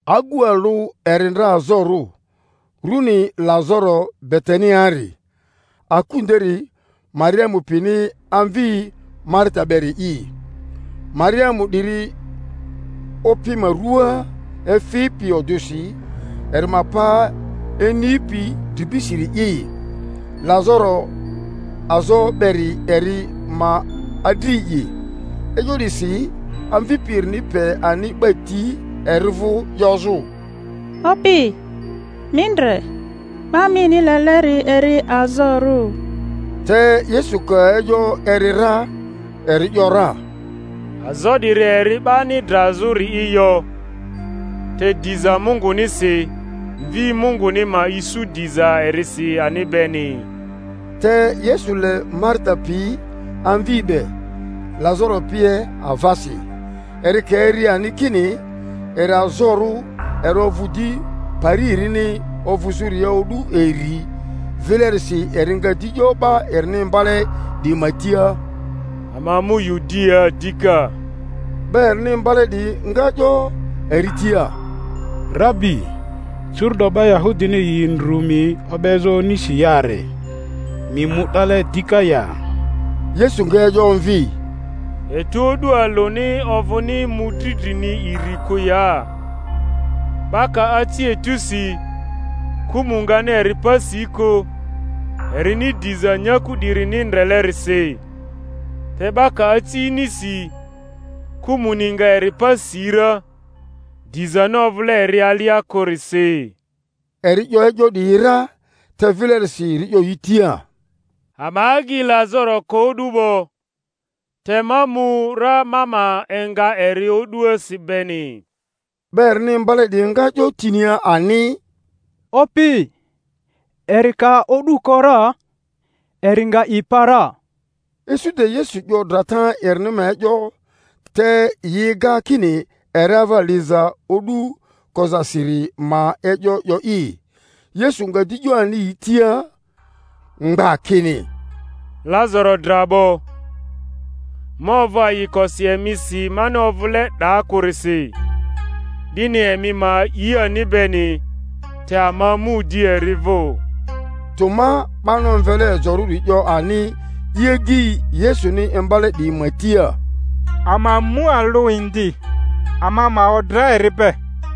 Agu alᴜ eri ndra azorᴜ, runi Lazaro Betaniari, aku nderi Mariamu pini amvi Marita beri'i. Mariamu 'diri Opi ma rua efipi odᴜsi eri ma pa inipi dribisiri'i; Lazaro azo beri eri ma adri'i. E'yo 'disi amvipi erini pe ani 'ba ti eri vᴜ 'yozᴜ, Opi, mi ndre, 'ba mini leleri eri azorᴜ. Te Yesu ka e'yo eri ra, eri ‘yora, Azo 'diri eri 'bani drazᴜri'i yo, te diza Mungunisi, Mvi Munguni ma isu diza erisi ani beni. Te Yesu le Marita pi, amvi be, Lazaro pie avasi. Eri ka eri ani kini eri azorᴜ, eri ovᴜ di pari erini ovᴜzᴜria o'du iri. Vilerisi eri nga di 'yo 'ba erini imbale 'diyi ma tia, Ama mu Yudiaa dika. 'Ba erini imbale 'diyi nga 'yo eri tia, Rabi, curu’do 'ba Yahudini yi ndrᴜ mi o'bezᴜ onisi yare; mi mu 'dale dika ya? Yesu nga e'yo omvi, Etu o'du alᴜni ovᴜni mᴜdri drini iri kᴜ ya? 'Ba ka aci etusi, kᴜmᴜ ngani eri pa si kᴜ, erini diza nyaku 'dirini ndrelerisi. Te 'ba ka aci inisi, kᴜmᴜni nga eri pa si ra, dizani ovᴜle eri alia kᴜrisi. Eri 'yo e'yo 'diyi ra, te vilerisi eri 'yo yi tia, Ama agyi Lazaro ko o'du 'bo, te ma mu ra ma ma enga eri o'duasi beni. 'Ba erini imbale 'diyi nga 'yo tinia ani, Opi, eri ka o'du ko ra, eri nga i pa ra. Isu de Yesu 'yo drata erini ma e'yo, te yi ega kini eri ava liza o'du kozasiri ma e'yo 'yo'i. Yesu nga di 'yo ani yi tia mgba kini, Lazaro dra 'bo. Ma ovᴜ ayikosi emisi mani ovᴜle 'daa kᴜrisi, 'dini emi ma a'i ani beni; te ama mu di eri vᴜ. Toma 'bani omvele Ejorᴜri 'yo ani i agyi Yesuni imbale 'diyi ma tia, Ama mu alᴜ indi, ama ma odra eri be.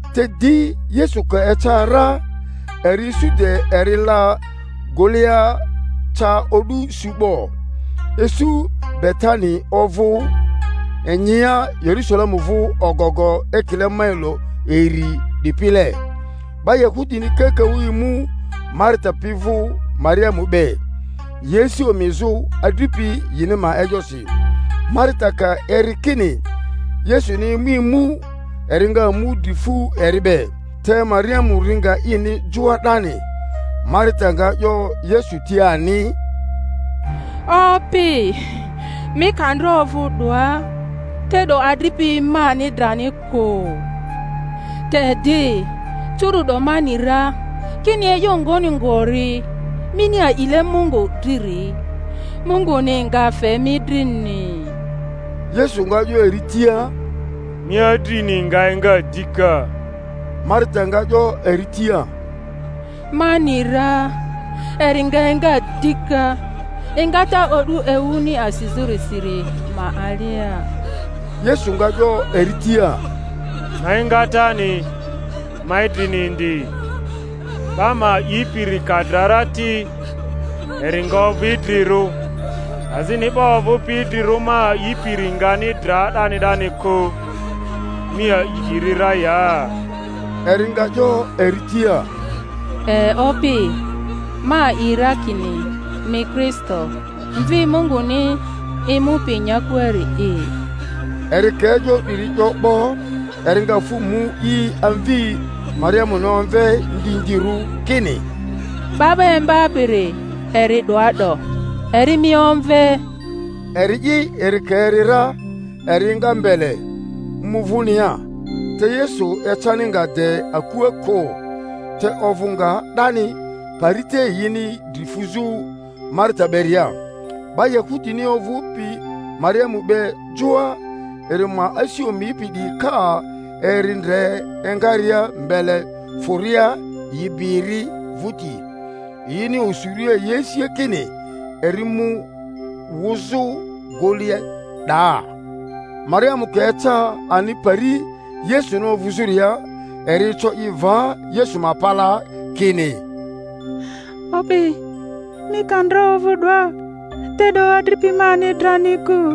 Te di Yesu ka eca ra, eri isu de eri la gᴜlea ca o'du su 'bo. Isu Betani ovᴜ inyia Yerusalemu vᴜ ogogo ekile mailo iri 'dipile; 'ba Yahudini kakaᴜ emu Marita pi vᴜ Mariamu be, yi asi omizᴜ adripi yini ma e'yosi. Marita ka eri kini Yesuni emu emu, eri nga mu dri fu eri be, te Mariamu ri nga ini joa 'dani. Marita nga 'yo Yesu tia ani, Opi, mi ka ndra ovᴜ 'doa, te'do adripi mani drani kᴜ. Te di curu’do ma ni ra kini e'yo ngoni ngori mini a'ile Mungᴜ driri, Mungᴜni nga fe mi drini. Yesu nga 'yo eri tia, Mi adrini nga enga dika. Marita nga 'yo eri tia, Ma ni ra eri nga enga dika engata o'du ewuni asizᴜrisiri ma alia. Yesu nga 'yo eri tia, Ma engatani, ma idrini indi; 'ba ma a'ipiri, ka dra ti, eri nga ovᴜ idrirᴜ; azini 'ba ovᴜpi idrirᴜ ma a'ipiri ngani dra 'dani 'dani kᴜ. Mi a'i 'diri ra ya? Eri nga 'yo eri tia, E, Opi; ma a'i ra kini mi Kristo, Mvi Munguni, emupi nyakuari'i. Eri ka e'yo 'diri 'yo 'bo, eri nga fᴜ mu i amvi Mariamuni omve ndindirᴜ, kini, 'Ba 'ba Imbapiri eri 'doa 'do, eri mi omve. Eri'i eri ka eri ra, eri enga mbele, mu vᴜnia. Te Yesu ecani nga de akua kᴜ, te ovᴜ nga 'dani pari te yini dri fuzᴜ Marita beria. 'Ba Yahudini ovᴜpi Mariamu be joa, eri ma asi omipi 'diyi, ka eri ndre engaria mbele fᴜria, yi bi eri vᴜti, yini osuria yi asia kini eri mu wᴜzᴜ gᴜlea 'daa. Mariamu ka eca ani pari Yesuni ovᴜzᴜria, eri eco i va Yesu ma palaa, kini, Opi, mi ka ndra ovᴜ 'doa, te'do adripi mani drani kᴜ.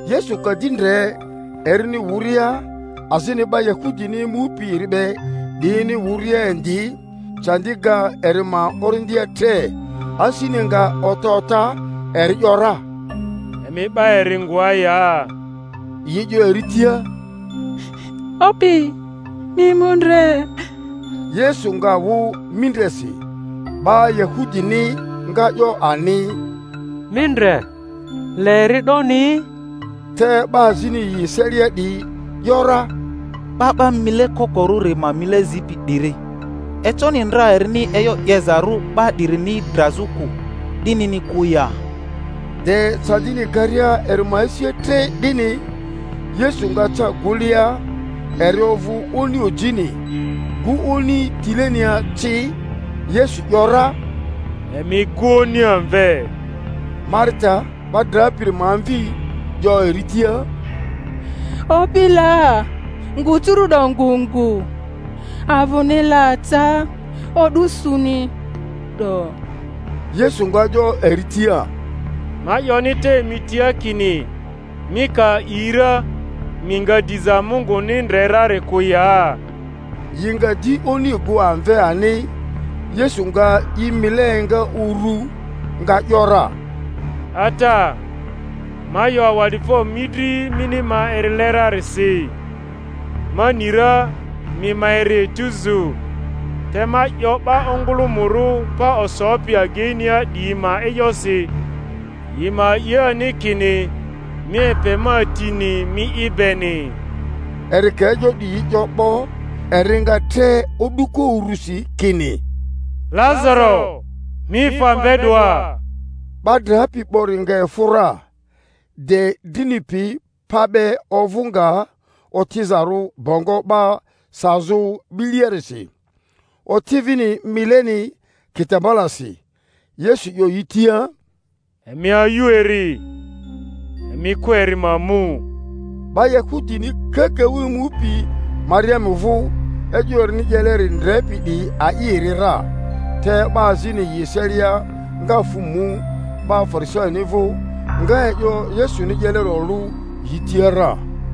Yesu ka di ndre erini wᴜria, azini 'ba Yahudini emupi eri be 'diyini wᴜria indi, candi ga eri ma orindia tre, asini nga ota ota; eri ‘yora, Emi 'ba eri ngoa ya? Yi 'yo eri tia, Opi, mi emu ndre. Yesu nga wᴜ mindresi. 'Ba Yahudini nga 'yo ani, Mi ndre, le eri 'doni! Te 'ba azini yi eselia 'diyi ‘yora, 'Ba 'ba mile kokorᴜri ma mile zipi 'diri, econi ndra erini e'yo 'yezarᴜ 'ba 'dirini drazᴜ kᴜ, 'dinini kᴜ ya? De candini garia eri ma asia tre 'dini, Yesu nga ca gᴜlea. Eri ovᴜ oni ojini, gᴜ oni tilenia ci. Yesu ‘yora, Emi gᴜ oni amve. Marita, 'ba drapiri ma amvi, 'yo eri tia, Opi la, ngᴜ curu'do ngu ngu; avᴜni la ca o'du suni 'do. Yesu nga 'yo eri tia, Ma 'yoni te mi tia kini mi ka a'i ra, mi nga diza Munguni ndre rari kᴜ ya? Yi nga di oni gᴜ amve ani. Yesu nga i mile enga uru, nga ‘yora, Ata, ma 'yo awa'difo mi dri mini ma erile rarisi. Ma ni ra mi ma eri etuzu, te ma 'yo 'ba ongᴜlᴜmᴜrᴜ pa osopi ageinia 'diyi ma e'yosi, yi ma a'i ani kini mi epe ma tini mi'i beni. Eri ka e'yo 'diyi 'yo 'bo, eri nga tre o'duko urᴜsi kini, Lazaro, mi efᴜ amve 'doa! 'Ba drapi 'bori nga efᴜ ra, de drini pi pa be ovᴜ nga otizarᴜ bongo 'ba sazᴜ 'biliarisi, oti vini mileni kitambalasi. Yesu 'yo yi tia, Emi ayu eri, emi kᴜ eri ma mu. 'Ba Yahudini kakaᴜ emupi Mariamu vᴜ, e'yo erini 'yeleri ndrepi 'diyi a'i eri ra; te 'ba azini yi eselia nga fᴜ mu 'ba Farisaini vᴜ, nga e'yo Yesuni 'yeleri olᴜ yi tia ra.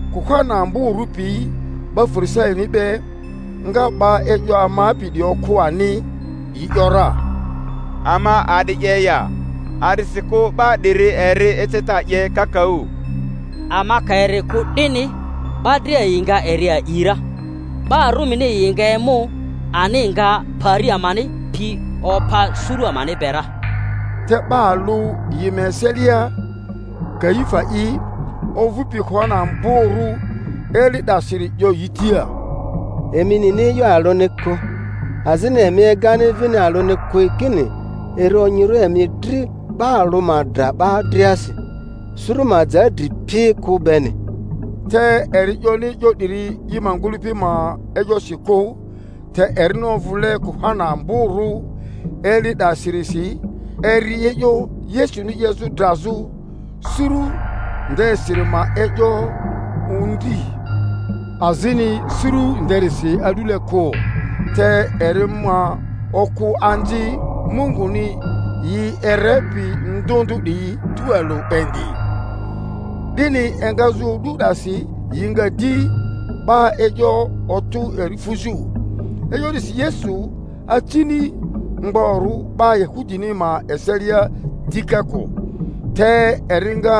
Kuhani amborᴜ piyi 'ba Fari-saini be nga 'ba e'yo amapi 'diyi okᴜ ani, yi ‘yora, Ama a'di 'ye ya? A'disikᴜ 'ba 'diri eri eceta 'ye kakaᴜ. Ama ka eri kᴜ 'dini, 'ba dria yi nga eri a'i ra; 'ba Rumini yi nga emu ani, nga pari amani pi opa suru amani be ra. Te 'ba alᴜ yi ma eselia, Kaifa'i, ovᴜpi kuhani amborᴜ eli 'dasiri 'yo yi tia, Emi nini e'yo alᴜni kᴜ; azini emi egani vini alᴜni kᴜ kini eri onyirᴜ emi dri 'ba alᴜ ma dra 'ba driasi, suru ma ja dri pi kᴜ beni. Te eri 'yoni e'yo 'diri i ma ngᴜlᴜpi ma e'yosi kᴜ, te erini ovᴜle kuhani amborᴜ eli 'dasirisi, eri e'yo Yesuni 'yezᴜ drazᴜ suru ndesiri ma e'yo ondri; azini suru nderisi a'dule kᴜ, te eri ma okᴜ anzi Mungᴜni yi erepi ndᴜ ndᴜ 'diyi tualᴜ indi. 'Dini engazᴜ o'du 'dasi yi nga di 'ba e'yo otᴜ eri fuzᴜ. E'yo 'disi Yesu acini mgborᴜ 'ba Yahudini ma eselia dika kᴜ, te eri nga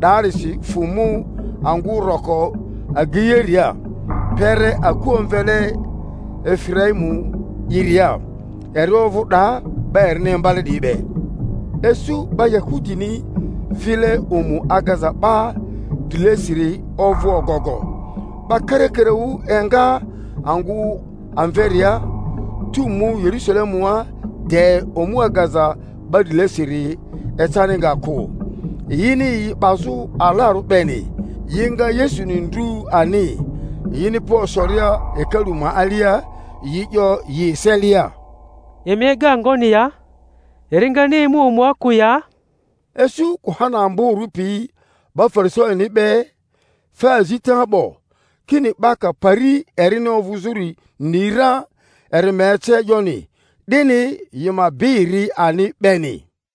'daarisi fᴜ mu angᴜ roko ageiaria, kpere aku omvele Efiraimu-'iria; eri ovᴜ 'daa 'ba erini imbale 'diyi be. Isu 'ba Yahudini vile omu agaza 'ba drilesiri ovᴜ ogogo; 'ba karakaraᴜ enga angᴜ amveria, tu mu Yerusalemua de omu agaza 'ba drilesiri ecani nga kᴜ, yini yi 'bazᴜ alarᴜ beni. Yi nga Yesuni ndru ani, yini pa osoria hekalu ma alia, yi 'yo yi eselia, Emi ega ngoni ya? Eri ngani emu omua kᴜ ya? Isu kuhani amborᴜ piyi 'ba Farisami be fe azita 'bo, kini 'ba ka pari erini ovᴜzᴜri ni ra, eri ma ece e'yoni, 'dini yi ma bi eri ani beni.